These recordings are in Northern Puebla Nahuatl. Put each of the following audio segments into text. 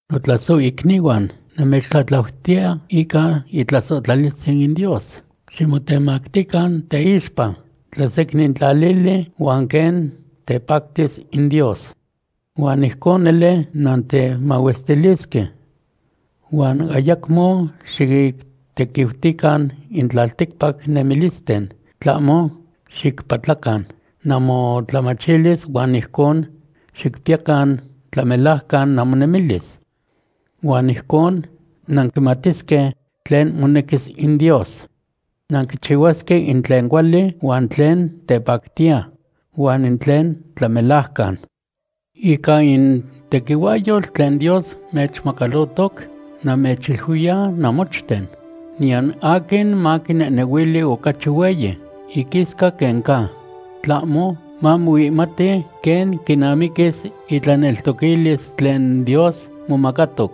Notlasohicnihuan, namechtlatlautiya ica itlasohtlalistzin in Dios, ximotemactican teixpa, tlasecnintlalili huan quen tepactis in Dios. Huan ijcon nele nantemahuestilisque. Huan ayacmo xictequiutican in tlalticpac nemilisten, tlahmo xicpatlacan namotlamachilis huan ijcon xicpiyacan tlamelajcan namonemilis. Huan ijcon nanquimatisque tlen monequis in Dios. Nanquichihuasque in tlen cuali, huan tlen tepactiya, huan in tlen tlamelajcan. Ica in tequihuahyotl tlen Dios nechmacalohtoc, namechiluiya namochten; niyan aquin maquinehnehuili ocachi hueyi iquisca quen ca. Tlahmo mamoihmati quen quinamiquis itlaneltoquilis tlen Dios momacatoc.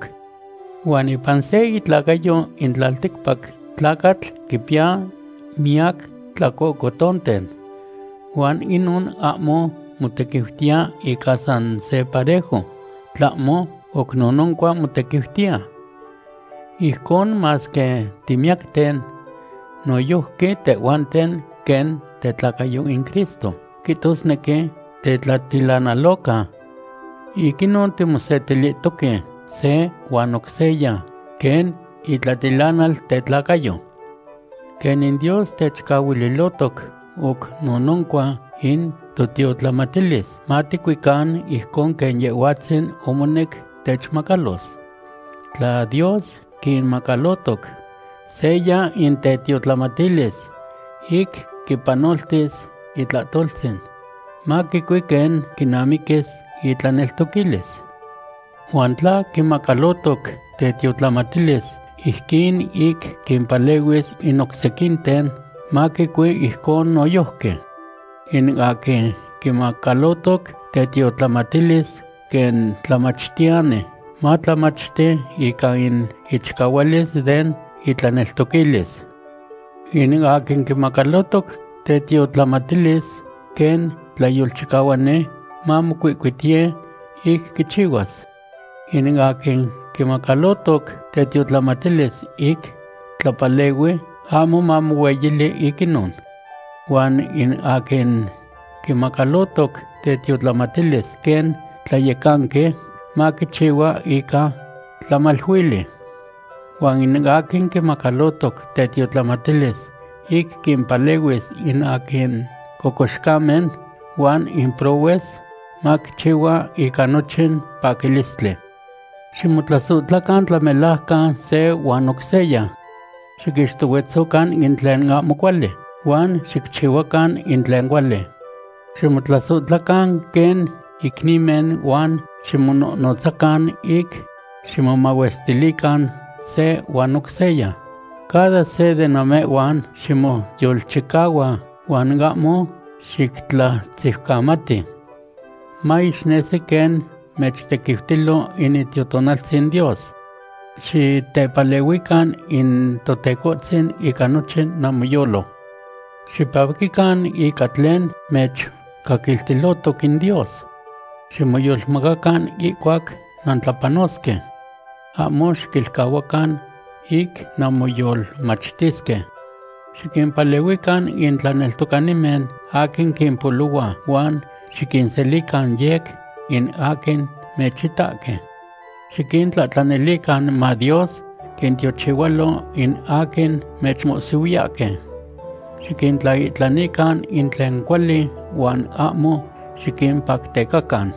Huan ipan se itlacayo in tlalticpac tlacatl quipiya miyac tlacohcotonten, huan inon ahmo motequiutiya ica san se parejo, tlahmo oc nononcua motequiutiya. Ijcon masque timiyacten, noyojqui tehhuanten quen tetlacayo in Cristo, quihtosnequi tetlatilanaloca. Ic inon timosetilihtoque se huan oc seya quen itlatilanal tetlacayo. Quen in Dios techcahuililotoc oc nononcua in totiotlamatilis, maticuican ijcon quen Yehhuatzin omonec techmacalos. Tla Dios quimacalotoc seya in tetiotlamatilis ic quipanoltis itlahtoltzin, maquicui quen quinamiquis itlaneltoquilis. Huan tla quimacalotoc tetiotlamatilis ijquin ic quimpalehuis in oc sequinten, maquicui ijcon noyojqui. In aquin quimacalotoc tetiotlamatilis quen tlamachtiyani, matlamachti ica in ichicahualis den itlaneltoquilis. In aquin quimacalotoc tetiotlamatilis quen tlayolchicahuani, mamocuihcuitiye ic quichihuas. In aquin quimacalotoc tetiotlamatilis ic tlapalehui, ahmo mamohueyili ic inon. Huan in aquin quimacalotoc tetiotlamatilis quen tlayecanqui, maquichihua ica tlamaluili. Huan in aquin quimacalotoc tetiotlamatilis ic quimpalehuis in aquin cocoxcamen huan in prohues, maquichihua ica nochin paquilistli. Ximotlasohtlacan tlamelajcan se huan oc seya. Xiquixtohuetzocan in tlen ahmo cuali, huan xicchihuacan in tlen cuali. Ximotlasohtlacan quen icnimen huan ximonohnotzacan ic ximomahuestilican se huan oc seya. Cada se de namehhuan ximoyolchicahua huan ahmo xictlatziucamati. Maixnesi quen mechtequiutilo in Itiotonaltzin Dios. Xitepalehuican in Totecohtzin ica nochin namoyolo. Xipaquican ica tlen mechcaquiltilotoc in Dios. Ximoyolmacacan ihcuac nantlapanosque. Ahmo xiquilcahuacan ic nanmoyolmachtisque. Xiquimpalehuican in tlaneltocanimen aquin quimpolohua huan xiquinselican yec in aquin mechitahque. Xiquintlahtlanilican ma Dios quintiochihualo in aquin mechmohsihuiyahque. ¡Xiquintlaihtlanican in tlen cuali huan ahmo xiquimpactecacan!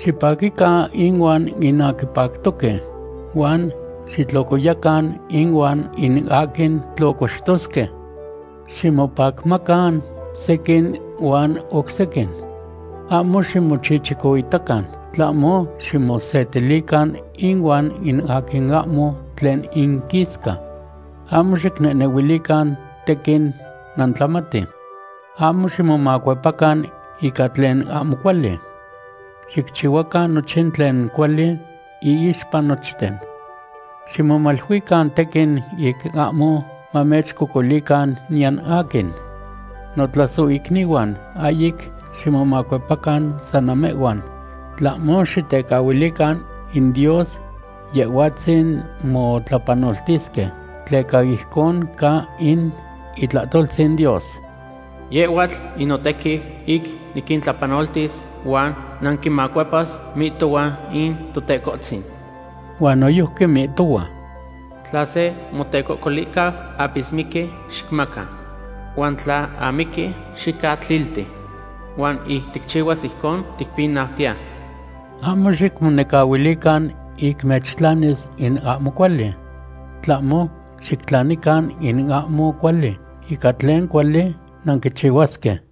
Xipaquican inuan in aquin pactoque huan xitlocoyacan inuan in aquin tlocoxtosque. Ximopacmacan sequin ihuan oc sequin. Ahmo ximochichicoitacan, tlahmo ximosetilican inuan in aquin ahmo tlen inquisca. Ahmo xicnehnehuilican tequin nantlamati. Ahmo ximomacuepacan ica tlen ahmo cuali. Xicchihuacan nochin tlen cuali iixpa nochten. Ximomaluican tequin ic ahmo mamechcocolican niyan aquin. Notlasohicnihuan, ahyic ximomacuepacan san namehhuan, tlahmo xitecahuilican in Dios Yehhuatzin motlapanoltisque, tleca ijcon ca in itlahtoltzin Dios: “Yehhuatl in notequiu ic niquintlapanoltis huan naquinmacuepas, mihtohua in Totecohtzin.” Huan noyojqui mihtohua: “Tla se motecocolicau apismiqui, xicmaca. Huan tla amiqui, xicatlilti. Huan ic ticchihuas ijcon, ticpinautiya.” Ahmo xicmonecahuilican ic mechtlanis in ahmo cuali. Tlahmo, xictlanican in ahmo cuali ica tlen cuali nanchihuasque.